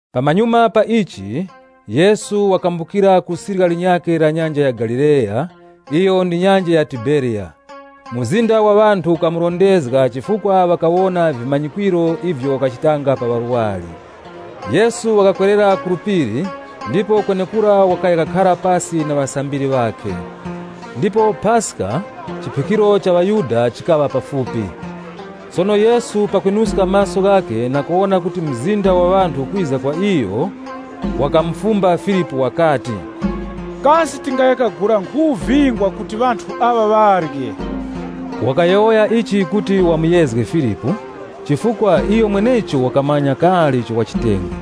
Pamanyuma pa ichi, Yesu wakambukira ku sirya linyakhe la Nyanja ya Galileya iyo ndi nyanja ya Tiberiya. Mzinda wa ŵanthu ukamurondezga chifukwa ŵakawona vimanyikwiro ivyo wakachita pa ŵarwari. Yesu wakakwerera ku phiri ndipo kwenekura wakaya kakhara pasi na ŵasambiri ŵakhe. Ndipo Paska, chiphikiro cha ŵaYuda, likaŵa pafupi. Sono Yesu pakwinuska maso ghakhe na kuwona kuti mzinda wa ŵanthu ukwiza kwa iyo, wakamufumba Filipu wakati, “Kasi tingaya kagula nkhu vingwa kuti ŵanthu aŵa ŵarye?” Wakayowoya ichi kuti wamuyezge Filipu, chifukwa iyo mwenecho wakamanya kale icho wachitenge.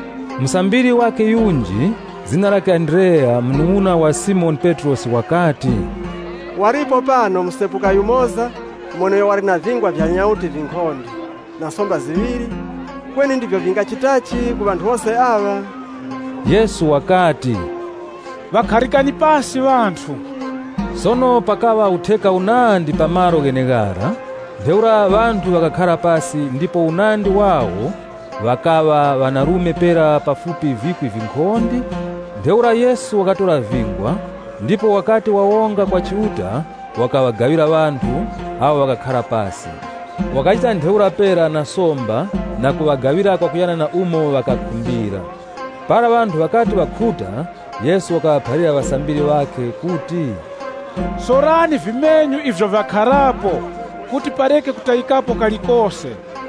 Musambiri wakhe yunji, zina lakhe Andreya, munung'una wa Simoni Petrosi, wakati, “Walipo pano musepuka yumoza mweneuyo wali na vingwa vya nyauti vinkhonde na somba ziŵiri. Kweni ndivyo vingachitachi ku ŵanthu wose aŵa?” Yesu wakati, “Ŵakharikani pasi ŵanthu.” Sono pakaŵa utheka unandi pa malo gheneghara. Ntheura ŵanthu ŵakakhara pasi ndipo unandi wawo ŵakaŵa ŵanarume pera pafupi vikwi vinkhonde. Ntheura Yesu wakatora vingwa, ndipo ŵakati wawonga kwa Chiuta, wakaŵagaŵira ŵanthu awo ŵakakhara pasi. Wakachita ntheura pera na somba na kuŵagaŵira kwakuyana na umo ŵakakhumbira. Para ŵanthu ŵakati ŵakhuta, Yesu wakaŵaphalira ŵasambiri ŵakhe kuti, “Sorani vimenyu ivyo vyakharapo, kuti pareke kutayikapo kalikose.”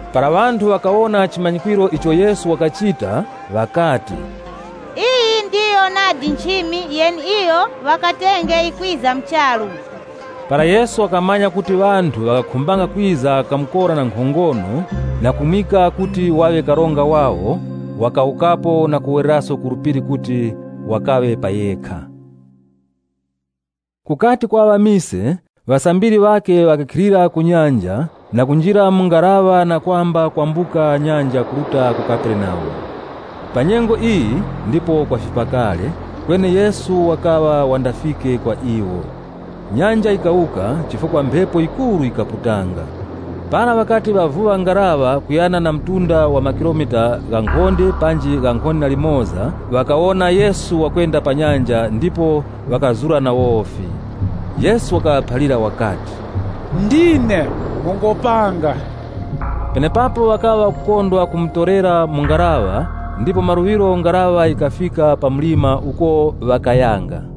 Para ŵanthu ŵakawona chimanyikwiro icho Yesu wakachita ŵakati, “Iyi ndiyo nadi nchimi yeneiyo ŵakatenge yikwiza mu charu!” Para Yesu wakamanya kuti ŵanthu ŵakakhumbanga kwiza kamukora na nkhongono na kumwimika kuti waŵe karonga wawo, wakawukapo na kuwereraso ku phiri kuti wakaŵe pa yekha. Kukati kwaŵa mise, ŵasambiri ŵakhe ŵakakhilira ku nyanja, na kunjira mu ngaraŵa na kwamba kwambuka nyanja kuruta ku Kaperenaumu. Pa nyengo iyi ndipo kwafipa kale, kweni Yesu wakaŵa wandafike kwa iwo. Nyanja yikawuka chifukwa mphepo yikuru yikaputanga. Para ŵakati ŵavuŵa ngaraŵa kuyana na mtunda wa makilomita ghankhonde panji ghankhonde na limoza, ŵakawona Yesu wakwenda pa nyanja, ndipo ŵakazura na wofi. Yesu wakaŵaphalira wakati, “Ndine, mungopanga.” Penepapo ŵakaŵa ŵakukondwa kumutorera mu ngaraŵa ndipo maluŵiro ngaraŵa yikafika pa mlima uko ŵakayanga.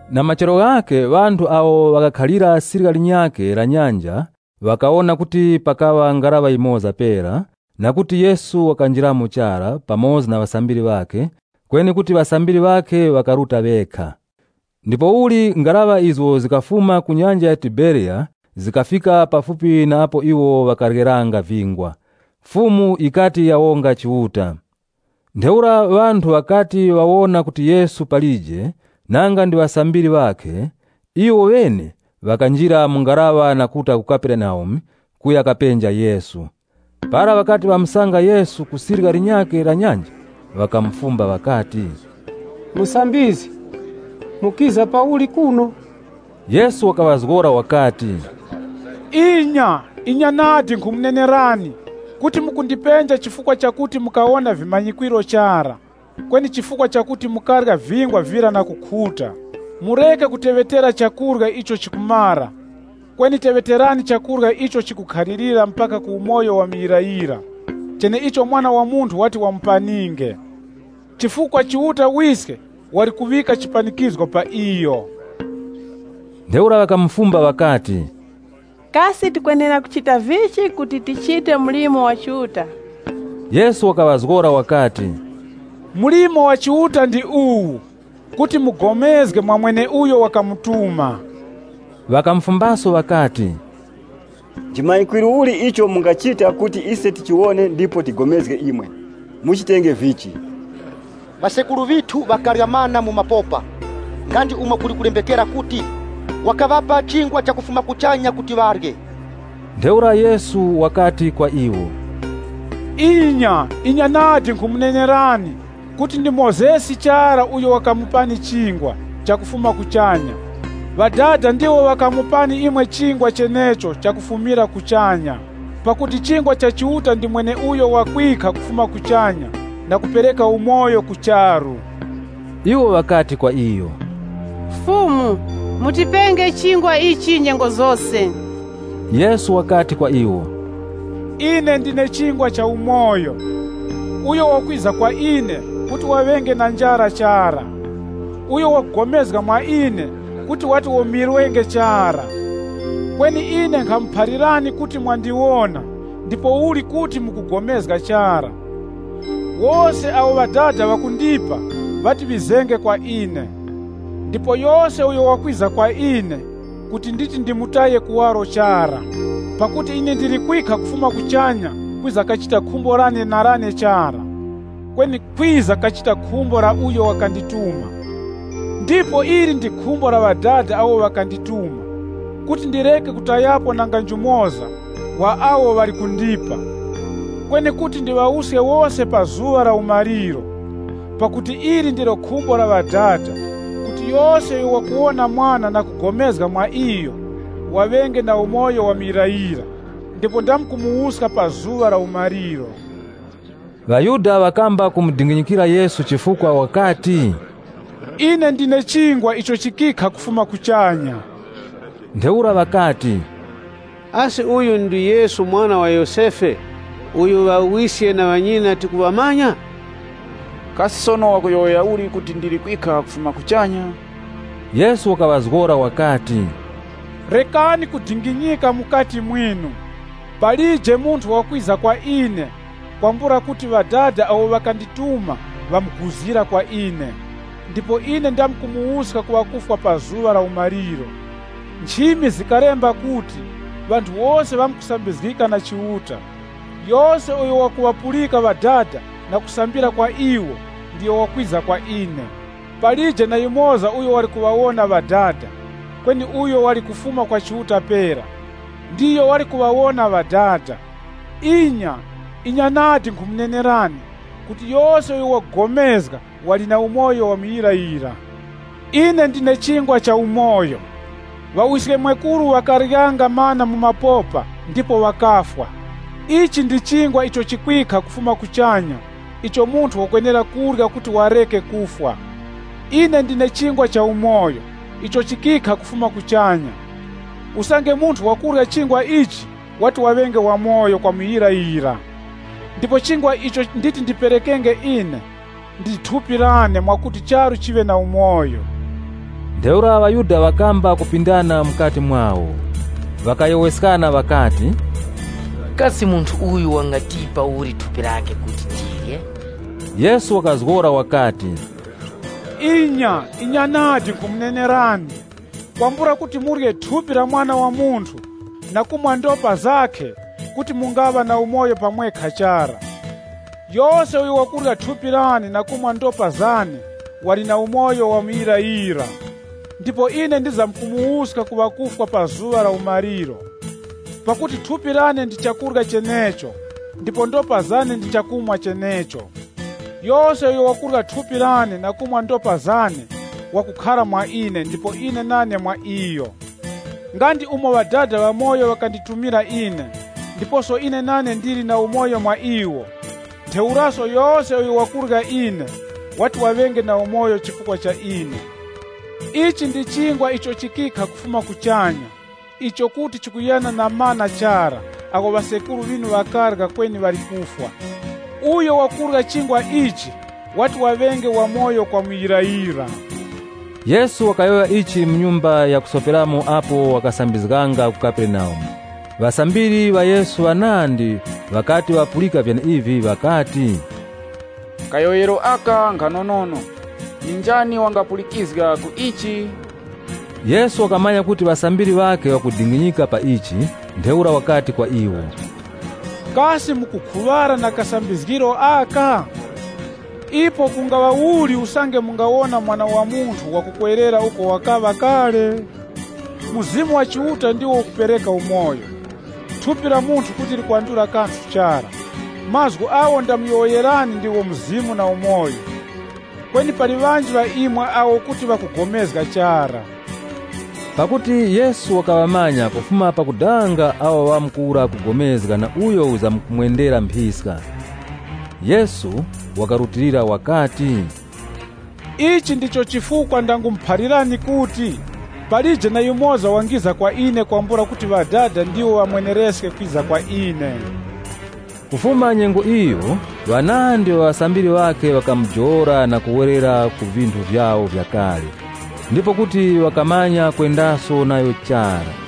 Na machero ghakhe ŵanthu awo ŵakakhalira sirya linyakhe la nyanja, ŵakawona kuti pakaŵa ngaraŵa yimoza pera, na kuti Yesu wakanjiramo chara pamoza na ŵasambiri ŵakhe, kweni kuti ŵasambiri ŵakhe ŵakaruta ŵekha. Ndipouli ngaraŵa izo zikafuma ku nyanja ya Tiberiya zikafika pafupi na apo iwo ŵakaryeranga vingwa Fumu yikati yawonga Chiuta. Ntheura ŵanthu ŵakati ŵawona kuti Yesu palije, nanga ndi ŵasambiri ŵakhe, iwoŵene ŵakanjira mu ngaraŵa na kuruta ku Kaperenaumu, kuya kapenja Yesu. Para ŵakati ŵamusanga Yesu ku sirya linyakhe la nyanja, ŵakamufumba ŵakati, “Musambizgi, mukiza pauli kuno?” Yesu wakaŵazgora wakati, “Inya, inya nadi, nkhumunenerani kuti mukundipenja chifukwa chakuti mukawona vimanyikwiro chara, kweni chifukwa chakuti mukarya vingwa vira na kukhuta. Mureke kuteŵetera chakurya icho chikumara, kweni teŵeterani chakurya icho chikukhalirira mpaka ku umoyo wa muyirayira, cheneicho Mwana wa Munthu wati wamupaninge. Chifukwa Chiuta Wiske wali kuŵika chimanyikwiro cha mazaza ghakhe pa iyo.” Ntheura ŵakamufumba ŵakati, “Kasi tikwenera kuchita vichi kuti tichite mlimo wa Chiuta?” Yesu wakaŵazgora wakati, “Mlimo wa Chiuta ndi uwu: kuti mupulikane na mweneuyo wakamutuma.” Ŵakamufumbaso ŵakati, “Nchimanyikwiro uli icho mungachita kuti ise tichiwone ndipo tipulikanenge namwe? Muchitenge vichi? Ŵasekuru ŵithu ŵakarya mana mu mapopa. Nga ndi umo kuli kulembekera kuti, ‘Wakaŵapa chingwa chakufuma kuchanya kuti ŵarye.’” Ntheura Yesu wakati kwa iwo, “Inya, inya nadi, nkhumunenerani kuti ndi Mozesi chara uyo wakamupani chingwa chakufuma kuchanya. Ŵadada ndiwo ŵakumupani imwe chingwa chenecho chakufumira kuchanya. Pakuti chingwa icho Chiuta wakupereka ndi mweneuyo wakwikha kufuma kuchanya na kupereka umoyo ku charu.” Iwo ŵakati kwa iyo, “Fumu, mutipenge chingwa ichi nyengo zose.” Yesu wakati kwa iwo, “Ine ndine chingwa cha umoyo. Uyo wakwiza kwa ine, kuti waŵenge na njara chara. Uyo wakupulikana mwa ine kuti wati womirwenge chara. Kweni ine nkhamuphalirani kuti mwandiwona, ndipouli kuti mukupulikana chara. Wose awo Ŵadada ŵakundipa, ŵati ŵizenge kwa ine. Ndipo yose uyo wakwiza kwa ine, kuti nditi ndimutaye kuwaro chara. Pakuti ine ndili kwikha kufuma kuchanya kwiza kachita khumbo lane na lane chara, kweni kwiza kachita khumbo la uyo wakandituma. Ndipo ili ndi khumbo la Ŵadada awo ŵakandituma, kuti ndireke kutayapo nanga njumoza wa awo ŵali kundipa. Kweni kuti ndiŵawuske wose pa zuŵa la umaliro. Pakuti ili ndilo khumbo la Ŵadada, kuti yose uyo wakuwona Mwana na kupulikana mwa iyo, waŵenge na umoyo wa muyirayira ndipo ndamkumuwuska pa zuŵa la umaliro.” ŴaYuda ŵakamba kumudinginyikira Yesu chifukwa wakati, “Ine ndine chingwa icho chikikha kufuma kuchanya.” Ntheura ŵakati, “Asi uyu ndi Yesu mwana wa Yosefe, uyo ŵawiske na ŵanyina tikuŵamanya? Kasi sono wakuyowoya uli kuti, ndili kwikha kufuma kuchanya?” Yesu wakaŵazgora wakati, “Rekani kudinginyika mukati mwinu. Palije munthu wakwiza kwa ine kwambula kuti Ŵadada awo ŵakandituma ŵamuguzira kwa ine, ndipo ine ndamkumuwuska ku ŵakufwa pa zuŵa la umaliro. Nchimi zikalemba kuti ‘Ŵanthu wose ŵamkusambizgika na Chiuta.’ Yose uyo wakuŵapulika Ŵadada na kusambira kwa iwo ndiyo wakwiza kwa ine. Palije na yumoza uyo wali kuwona Ŵadada, kweni uyo wali kufuma kwa Chiuta pera, ndiyo wali kuŵawona Ŵadada. Inya, inya nadi, nkhumunenerani kuti yose uyo wakupulikana wali na umoyo wa muyirayira. Ine ndine chingwa cha umoyo. Ŵawiskemwekuru ŵakaryanga mana mu mapopa ndipo ŵakafwa. Ichi ndi chingwa icho chikwikha kufuma kuchanya icho munthu wakwenera kurya kuti wareke kufwa. Ine ndine chingwa chamoyo icho chikikha kufuma kuchanya. Usange munthu wakurya chingwa ichi wati waŵenge wamoyo kwa muyirayira. Ndipo chingwa icho nditi ndiperekenge ine, ndi thupi lane mwakuti charu chiŵe na umoyo.” Ntheura ŵaYuda ŵakamba kupindana mukati mwawo. Ŵakayowoyeskana ŵakati, “Kasi munthu uyu wangatipa uli thupi lakhe kuti tirye?” Yesu wakazgora wakati, “Inya, inya nadi, nkhumunenerani, kwambula kuti murye thupi la Mwana wa Munthu, na kumwa ndopa zakhe, kuti mungaŵa na umoyo pa mwekha chara. Yose uyo wakurya thupi lane na kumwa ndopa zane wali na umoyo wa muyirayira. Ndipo ine ndizamkumuwuska ku ŵakufwa pa zuŵa la umaliro. Pakuti thupi lane ndi chakurya chenecho ndipo ndopa zane ndi chakumwa chenecho. Yose uyo wakurya thupi lane na kumwa ndopa zane, wakukhara mwa ine ndipo ine nane mwa iyo. Nga ndi umo Ŵadada ŵamoyo ŵakanditumira ine, ndiposo ine nane ndili na umoyo mwa iwo, ntheuraso yose uyo wakurya ine, wati waŵenge na umoyo chifukwa cha ine. Ichi ndi chingwa icho chikikha kufuma kuchanya icho kuti chikuyana na mana chara agho ŵasekuru ŵinu ŵakarya kweni ŵali kufwa. Uyo wakurya chingwa ichi wati waŵenge wamoyo kwa muyirayira.” Yesu wakayowoya ichi mu nyumba ya kusoperamo apo wakasambizganga ku Kaperenaumu. Ŵasambiri ŵa Yesu ŵanandi ŵakati ŵapulika vyeneivi ŵakati, “Kayowoyero aka nkhanonono, ndi njani wangapulikizga ku ichi.” Yesu wakamanya kuti ŵasambiri ŵakhe ŵakudinginyika pa ichi, ntheura wakati kwa iwo, “Kasi mukukhuŵara na kasambizgiro aka? Ipo kungaŵa uli usange mungawona Mwana wa Munthu wakukwerera uko wakaŵa kale? Mzimu wa Chiuta ndiwo ukupereka umoyo, thupi la munthu kuti likwandula kanthu chara. Mazgu agho ndamuyowoyerani ndigho Mzimu na umoyo. Kweni pali ŵanji ŵa imwe awo kuti ŵakupulikana chara.” (Pakuti Yesu wakaŵamanya kufuma pakudanga awo ŵamkuwura kupulikana na uyo wizamkumwendera mphiska.) Yesu wakarutilira wakati, “Ichi ndicho chifukwa ndangumuphalirani kuti, palije na yumoza wangiza kwa ine kwambula kuti Ŵadada ndiwo ŵamwenereske kwiza kwa ine.” Kufuma nyengo iyo ŵanandi ŵa ŵasambiri ŵakhe ŵakamujowola na kuwerera ku vinthu vyawo vya kale, ndipo kuti ŵakamanya kwendaso nayo chara.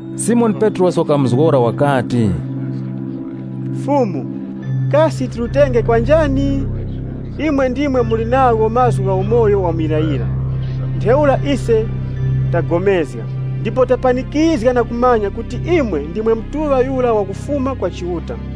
Simoni Petrosi wakamuzgora wakati, “Fumu, kasi tirutenge kwa njani? Imwe ndimwe muli nagho mazgu gha umoyo wa muyirayira. Ntheura ise tapulikana, ndipo tapanikizga na kumanya kuti imwe ndimwe Mutuŵa Yura wa Chiuta.”